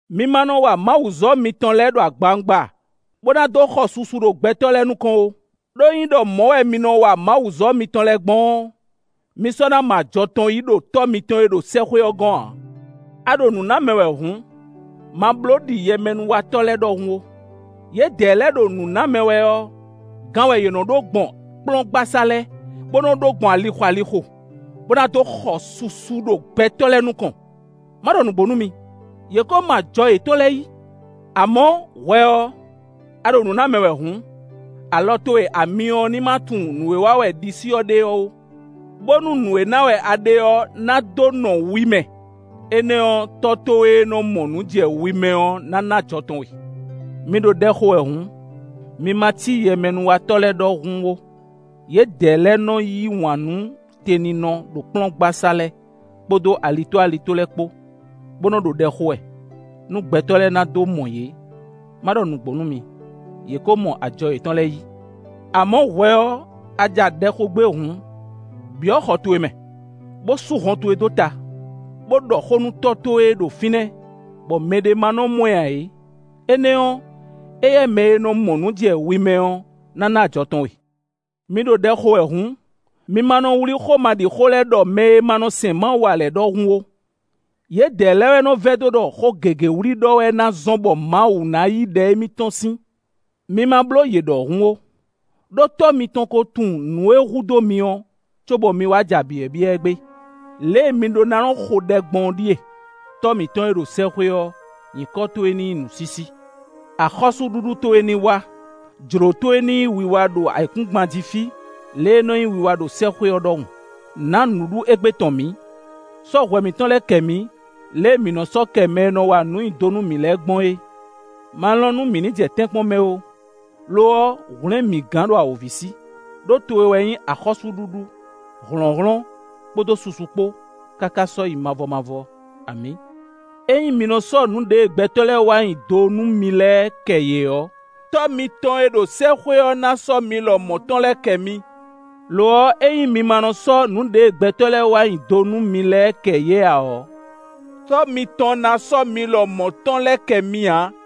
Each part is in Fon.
“Mi ma nɔ wa Mawuzɔ́ mitɔn lɛ́ɛ ɖo agbawungba bo na dó xɔ susu ɖo gbɛtɔ́ lɛ́ɛ nukɔn ó. Ɖó, ényí ɖɔ mɔ̌ wɛ mi nɔ wa Mawuzɔ́ mitɔn lɛ́ɛ gbɔn ɔ́, mi sɔ́ ná mɔ ajɔ tɔn yí ɖo Tɔ́ mitɔn e ɖo sɛ́xwé ɔ́ gɔ́n ǎ. A ɖo nǔ ná mɛ wɛ hǔn, ma bló ɖi yɛmɛnúwatɔ́ lɛ́ɛ ɖɔhun ó; yědɛɛ lɛ́ɛ ɖo nǔ ná mɛ wɛ ɔ́, gan wɛ yě nɔ ɖó gbɔn kplɔ́ngbasá lɛ́ɛ, bó nɔ́ ɖó gbɔn alixo alixo, bó ná dó xɔ susu ɖo gbɛtɔ́ lɛ́ɛ nukɔn. Má ɖɔ nǔgbó nú mi: yě ko mɔ ajɔ yětɔn lɛ́ɛ yí. Amɔ̌, hwɛ ɔ́, a ɖo nǔ ná mɛ wɛ hǔn, alɔ towe amyɔ ɔ́ ní má tunwun nǔ e wa wɛ ɖisí ɔ́ ɖe ɔ́ ó, bónú nǔ e ná wɛ a ɖe ɔ́ ná dó nɔ wi mɛ; énɛ́ ɔ́, Tɔ́ towe e nɔ mɔ nǔ jɛ wi mɛ ɔ́ ná ná ajɔ tɔn we.” “Mi ɖo ɖɛ xo wɛ hǔn, mi ma cí yɛmɛnúwatɔ́ lɛ́ɛ ɖɔhun ó; yědɛɛ lɛ́ɛ nɔ yí wǎn nú te ninɔ ɖo kplɔ́ngbasá lɛ́ɛ kpódó alitó alitó lɛ́ɛ kpó, bo nɔ ɖo ɖɛ xo wɛ, nú gbɛtɔ́ lɛ́ɛ na dó mɔ yě. Má ɖɔ nǔgbó nú mi: yě ko mɔ ajɔ yětɔn lɛ́ɛ yí. Amɔ̌, hwɛ ɔ́, a ja ɖɛ xo gbé hǔn, byɔ̌ xɔ towe mɛ, bó sú hɔn towe dó ta, bó ɖɔ xó nú Tɔ́ towe e ɖo fínɛ́ bɔ mɛɖé ma nɔ mɔ ǎ é; énɛ́ ɔ́, éyɛ́ mɛ e nɔ mɔ nǔ jɛ wi mɛ ɔ́ ná ná ajɔ tɔn we. “Mi ɖo ɖɛ xo wɛ hǔn, mi ma nɔ wlí xómaɖixó lɛ́ɛ ɖɔ mɛ e ma nɔ sɛn Mawu ǎ lɛ́ɛ ɖɔhun ó; yědɛɛ lɛ́ɛ wɛ nɔ vɛdó ɖɔ xó gěgé wlí ɖɔ wɛ ná zɔ́n bɔ Mawu ná yí ɖɛ émítɔn sín. Mi ma bló yě ɖɔhun ó; ɖó Tɔ́ mitɔn ko tunwun nǔ e hu dó mi ɔ́, cóbɔ mi wá ja byɔ̌byɔ́ ɛ gbé. Lě e mi ɖó ná nɔ xo ɖɛ gbɔn ɔ́ ɖíe: ‘Tɔ́ mǐtɔn e ɖo sɛ́xwé ɔ́, nyǐkɔ towe ní nyí nǔsísí. Axɔ́súɖuɖu towe ní wá; jlǒ towe ní nyí wiwa ɖo ayǐkúngban jí fí, lě e é nɔ nyí wiwa ɖo sɛ́xwé ɔ́ ɖɔhun. Nǎ nǔɖuɖu égbé tɔn mǐ. Sɔ́ hwɛ mǐtɔn lɛ́ɛ kɛ mǐ, lě e mǐ nɔ sɔ́ kɛ mɛ e nɔ wa nǔ nyi do nú mǐ lɛ́ɛ gbɔn é. Ma lɔn nú mǐ ní jɛ tɛ́nkpɔ́n mɛ ó, lo ɔ́, hwlɛ̌n mǐ gán ɖo awǒvi sí.’ [Ɖó towe wɛ nyí axɔ́súɖuɖu, hlɔ̌nhlɔ́n, kpódó susu kpó, káká sɔ́yi mavɔ mavɔ! Amǐ.] “Ényí mi nɔ sɔ́ nǔ ɖěe gbɛtɔ́ lɛ́ɛ wa nyi do nú mi lɛ́ɛ kɛ yě ɔ́, Tɔ́ mitɔn e ɖo sɛ́xwé ɔ́ ná sɔ́ mi lɔmɔ̌ tɔn lɛ́ɛ kɛ mi. Lo ɔ́, ényí mi ma nɔ sɔ́ nǔ ɖěe gbɛtɔ́ lɛ́ɛ wa nyi do nú mi lɛ́ɛ kɛ yě ǎ ɔ́, Tɔ́ mitɔn ná sɔ́ mi lɔmɔ̌ tɔn lɛ́ɛ kɛ mi ǎ.”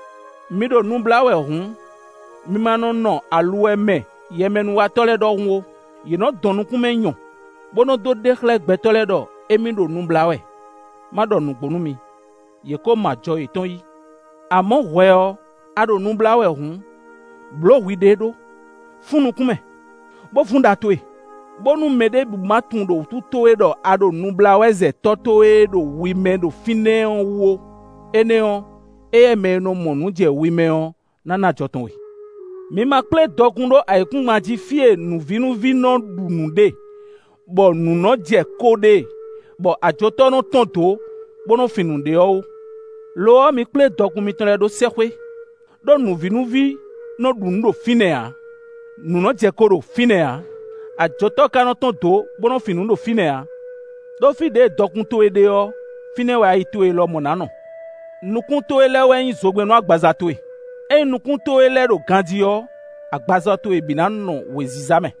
“Mi ɖo nu blá wɛ hǔn, mi ma nɔ nɔ aluwɛ mɛ yɛmɛnúwatɔ́ lɛ́ɛ ɖɔhun ó; yě nɔ dɔn nukún mɛ nyɔ, bo nɔ dó ɖe xlɛ́ gbɛtɔ́ lɛ́ɛ ɖɔ émí ɖo nu blá wɛ. Má ɖɔ nǔgbó nú mi, yě ko mɔ ajɔ yětɔn yí. Amɔ̌, hwɛ ɔ́, a ɖo nu blá wɛ hǔn, blǒ hwiɖée ɖó; fún nukún mɛ, bo vún ɖa towe, bónú mɛ ɖěbǔ ma tunwun ɖo wútu towe ɖɔ a ɖo nu blá wɛ zɛ Tɔ́ towe e ɖo wi mɛ ɖo fínɛ́ ɔ́ wú ó; énɛ́ ɔ́, éyɛ́ mɛ e nɔ mɔ nǔ jɛ wi mɛ ɔ́ ná ná ajɔ tɔn we.” “Mi ma kplé dɔkun ɖó ayǐkúngban jí fí e nǔvínúví nɔ ɖu nǔ ɖe, bɔ nǔ nɔ jɛ ko ɖe, bɔ ajotɔ́ nɔ tɔ́n dǒ, bó nɔ́ fin nǔ ɖe ɔ́ ó. Lo ɔ́, mi kplé dɔkun mitɔn lɛ́ɛ ɖó sɛ́xwé; ɖó nǔvínúví nɔ́ ɖu nǔ ɖo fínɛ́ ǎ; nǔ nɔ́ jɛ ko ɖo fínɛ́ ǎ; ajotɔ́ ka nɔ́ tɔ́n dǒ, bó nɔ́ fin nǔ ɖo fínɛ́ ǎ. Ɖó fí ɖěe dɔkun towe ɖe ɔ́, fínɛ́ wɛ ayi towe lɔmɔ̌ ná nɔ.” “Nukún towe lɛ́ɛ wɛ nyí zogbɛ́n nú agbaza towe; ényí nukún towe lɛ́ɛ ɖo ganjí ɔ́, agbaza towe bǐ ná nɔ wěziza mɛ.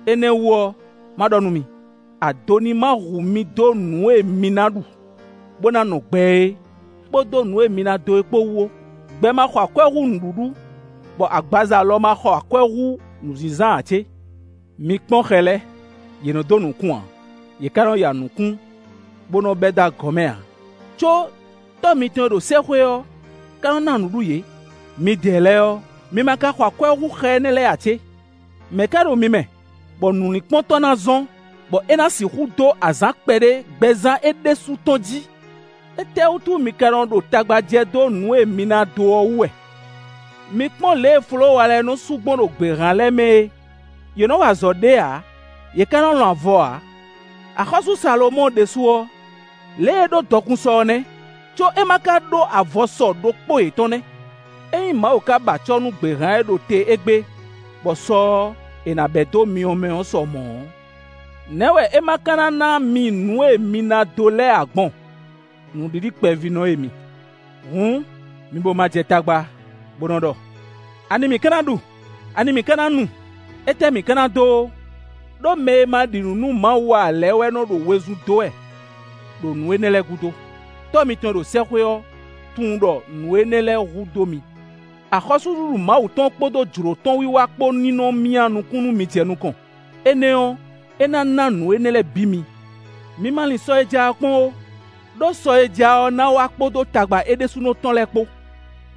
“Énɛ́ wú ɔ́, má ɖɔ nú mi: ado ní ma hu mi dó nǔ e mi na ɖu, bo na nɔ gbɛ é, kpódó nǔ e mi na dó é kpó wú ó; gbɛ ma xɔ akwɛ́ hú nǔɖuɖu, bɔ agbaza lɔ ma xɔ akwɛ́ hú nǔzínzán ǎ cé? Mi kpɔ́n xɛ lɛ́ɛ; yě nɔ dó nǔkún ǎ, yě ká nɔ ya nǔkún bó nɔ́ bɛ́ dó agɔ̌ mɛ ǎ; có Tɔ́ mitɔn e ɖo sɛ́xwé ɔ́ ka nɔ́ ná nǔɖuɖu yě. Midɛɛ lɛ́ɛ ɔ́, mi ma ka xɔ akwɛ́ hú xɛ énɛ́ lɛ́ɛ ǎ cé? Mɛ̌ ka ɖo mi mɛ, bɔ nǔlinkpɔ́n tɔn ná zɔ́n, bɔ é ná sixú dó azǎn kpɛɖé gbɛzán é ɖésú tɔn jí? “Étɛ́wútu mi ka nɔ ɖo tagba jɛ dó nǔ e mi ná dó ɔ́ wú wɛ? Mi kpɔ́n lě e folówa lɛ́ɛ nɔ su gbɔn ɖo gběhan lɛ́ɛ mɛ é; yě nɔ wa azɔ̌ ɖě ǎ, yě ká nɔ lɔn avɔ ǎ. Axɔ́sú Salomɔ́ɔ ɖésú ɔ́, lě e é ɖó dɔkun sɔ ɔ́ nɛ́, có é ma ka ɖó avɔ sɔ ɖokpó yětɔn nɛ́! Ényí Mawu ka ba acɔ́ nú gběhan e ɖo te égbé, bɔ sɔ ɔ́, è nǎ bɛ̌ dó myɔ mɛ ɔ́ sɔ mɔ̌ ɔ́, nɛ̌ wɛ é ma ka ná ná mi nǔ e mi ná dó lɛ́ɛ ǎ gbɔn, nǔɖiɖi kpɛvínɔ e mi? Hǔn, mi bo ma jɛ tagba, bó nɔ́ ɖɔ: ‘Ani mǐ ka ná ɖu’; ‘ani mǐ ka ná nu’; ‘étɛ́ mǐ ka ná dó’ ó. Ɖó mɛ e ma ɖi nǔ nú Mawu ǎ lɛ́ɛ wɛ nɔ́ ɖo wezun dó wɛ, ɖo nǔ énɛ́ lɛ́ɛ gúdo. Tɔ́ mǐtɔn e ɖo sɛ́xwé ɔ́ tunwun ɖɔ nǔ énɛ́ lɛ́ɛ hu dó mi. Axɔ́súɖuɖu Mawu tɔn kpódó jlǒ tɔn wiwa kpó ní nɔ́ myá nukún nú mi jɛ nukɔn; énɛ́ ɔ́, é ná ná nǔ énɛ́ lɛ́ɛ bǐ mi. Mi ma lin sɔ e ja ɔ́ kpɔ́n ó, ɖó sɔ e ja ɔ́ ná wá kpódó tagba é ɖésúnɔ tɔn lɛ́ɛ kpó.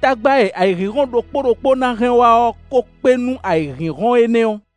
Tagba e ayǐhínhɔ́n ɖokpó ɖokpó ná hɛn wá ɔ́ ko kpé nú ayǐhínhɔ́n énɛ́ ɔ́.”